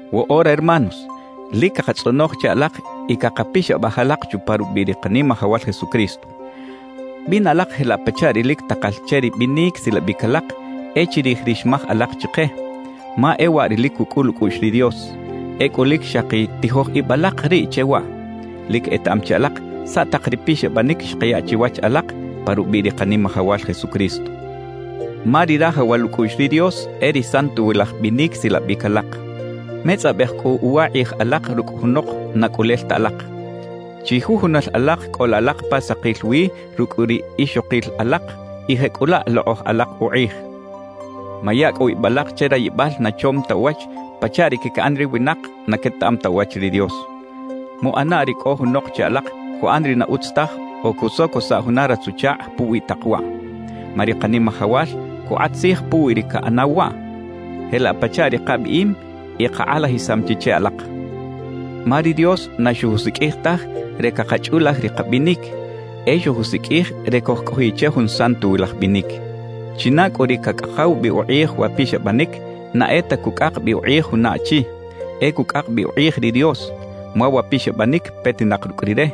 Woꞌora hermanos, lic cakatzꞌonoj che alak y cakapixabaj alak chupa rubiꞌ ri Kanimajawal Jesucristo: Bina alak jelaꞌ pachaꞌ ri lic takal che ri binic silabic alak e chirij ri xmaj alak chike, ma e waꞌ ri lic cucꞌul ucꞌuꞌx ri Dios; ecꞌu lic xaki tijoj ib alak riꞌ che waꞌ. Lic etaꞌam chi alak saꞌ tak ri pixabanic xkaya chiwach alak pa rubiꞌ ri Kanimajawal Jesucristo, ma ri rajawal ucꞌuꞌx ri Dios e ri santowilaj binic silabic alak. Metzꞌabej cꞌu uwa kꞌij alak rucꞌ junok na cꞌulel ta alak. Chijujunal alak cꞌola alak pa sakil wi rucꞌ ri ixokil alak y jecꞌulaꞌ lokꞌoj alak ukꞌij. Maya cꞌu ib alak che rayibal na chom ta uwach pachaꞌ ri caquiꞌan ri winak na quetaꞌam ta uwach ri Dios. Muꞌana ri cꞌo junok che alak cuꞌan ri na utz taj o cusocosaꞌ juna ratz-uchakꞌ puwi tak waꞌ, ma ri Kanimajawal cukꞌat tzij puwi ri caꞌanaw waꞌ, jelaꞌ pachaꞌ ri kabiꞌim y kakꞌalajisam chi che alak. Ma ri Dios na xojusiqꞌuij taj re cakachꞌulaj ri kabinic, e xojusiqꞌuij re cojcꞌojiꞌ che jun santowilaj binic. China cꞌu ri cacꞌakaw bi ukꞌij wa pixabanic, na e ta cucꞌak bi ukꞌij juna achi, e cucꞌak bi ukꞌij ri Dios, ma wa pixabanic petinak rucꞌ Rire,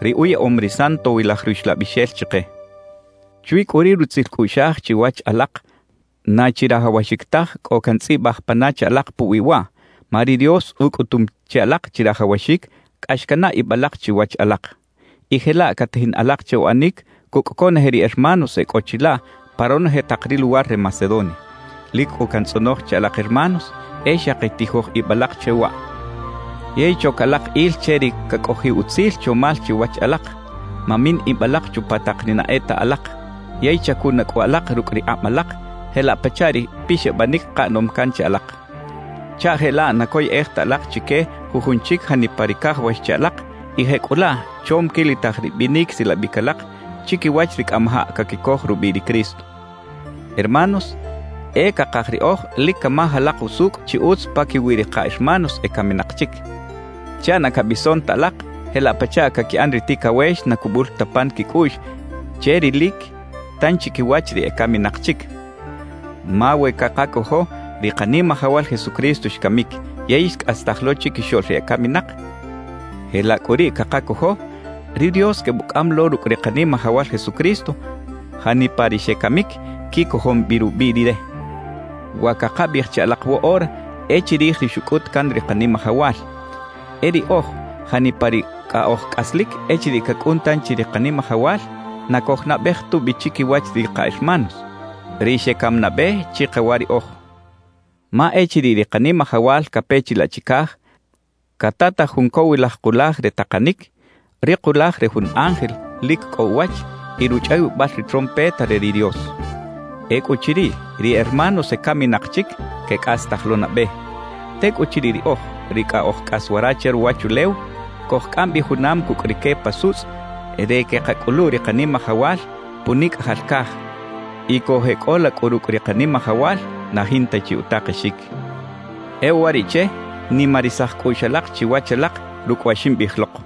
ri uyaꞌom ri Santowilaj Ruxlabixel chike. Chwi cꞌu ri rutzil cꞌuꞌxaj chiwach alak, na chirajawaxic taj cꞌo cantzꞌibaj pana che alak puwi waꞌ, ma ri Dios ucꞌutum che alak chirajawaxic cꞌax canaꞌ ib alak chiwach alak, y jelaꞌ catajin alak che uꞌanic cucꞌ conoje ri hermanos e cꞌo chilaꞌ pa ronoje tak ri luwar re Macedonia. Lic cꞌu cantzꞌonoj che alak hermanos, e xaki tijoj ib alak che waꞌ. Yey choc alak il che ri cacꞌojiꞌ utzil chomal chiwach alak; mamin ib alak chupa tak ri na e ta alak. Yey chacuna cꞌu alak rucꞌ ri kꞌab alak jelaꞌ pachaꞌ ri pixabanic kaꞌanom can che alak, chaꞌ jelaꞌ na coyꞌej ta alak chique jujun chic janipa ri cajawax che alak y jecꞌulaꞌ chom quilitaj ri binic silabic alak chiquiwach ri cꞌamajaꞌ caquicoj rubiꞌ ri Cristo. Hermanos, e cakaj riꞌoj lic camaj alak usucꞌ chi utz paquiwi ri ka hermanos ecaminak chic, chaꞌ na cabison ta alak jelaꞌ pachaꞌ caquiꞌan ri ticawex na cubul ta pan quicꞌuꞌx che rilic tanchi quiwach ri ecaminak chic. Ma we cakacojo ri Kanimajawal Jesucristo xcamic yey xcꞌastaj lo chiquixoꞌl ri ecaminak; jelaꞌ cꞌu riꞌ cakacojo, ri Dios quebucꞌam lo rucꞌ ri Kanimajawal Jesucristo janipa ri xecamic quicojom bi rubiꞌ Rire. Wa cakabiꞌij che alak woꞌora e chirij ri xucꞌut can ri Kanimajawal: E riꞌoj janipa ri cꞌa oj cꞌaslic echiriꞌ cacꞌun tanchi ri Kanimajawal, na cojnabej tubi chiquiwach ri ka hermanos, ri xecam nabe chikawa riꞌoj. Ma echiriꞌ ri Kanimajawal cape chilaꞌ chicaj, catataj jun cowilaj kulaj re takanic, ri kulaj re jun ángel lic cꞌo uwach y ruchꞌawibal ri trompeta re ri Dios. Ecꞌuchiriꞌ, ri hermanos ecaminak chic, quecꞌastaj lo nabe. Tecꞌuchiriꞌ riꞌoj, ri cꞌa oj cꞌas wara che ruwachulew, cojcꞌam bi junam cucꞌ rique pa sutzꞌ re queꞌkacꞌulu ri Kanimajawal punicꞌajal caj. Y cojeꞌcꞌola cꞌu rucꞌ ri Kanimajawal na jinta chi utakexic. E uwariꞌche, nimarisaj cꞌuꞌx alak chiwach alak rucꞌ wa ximbiꞌij lok.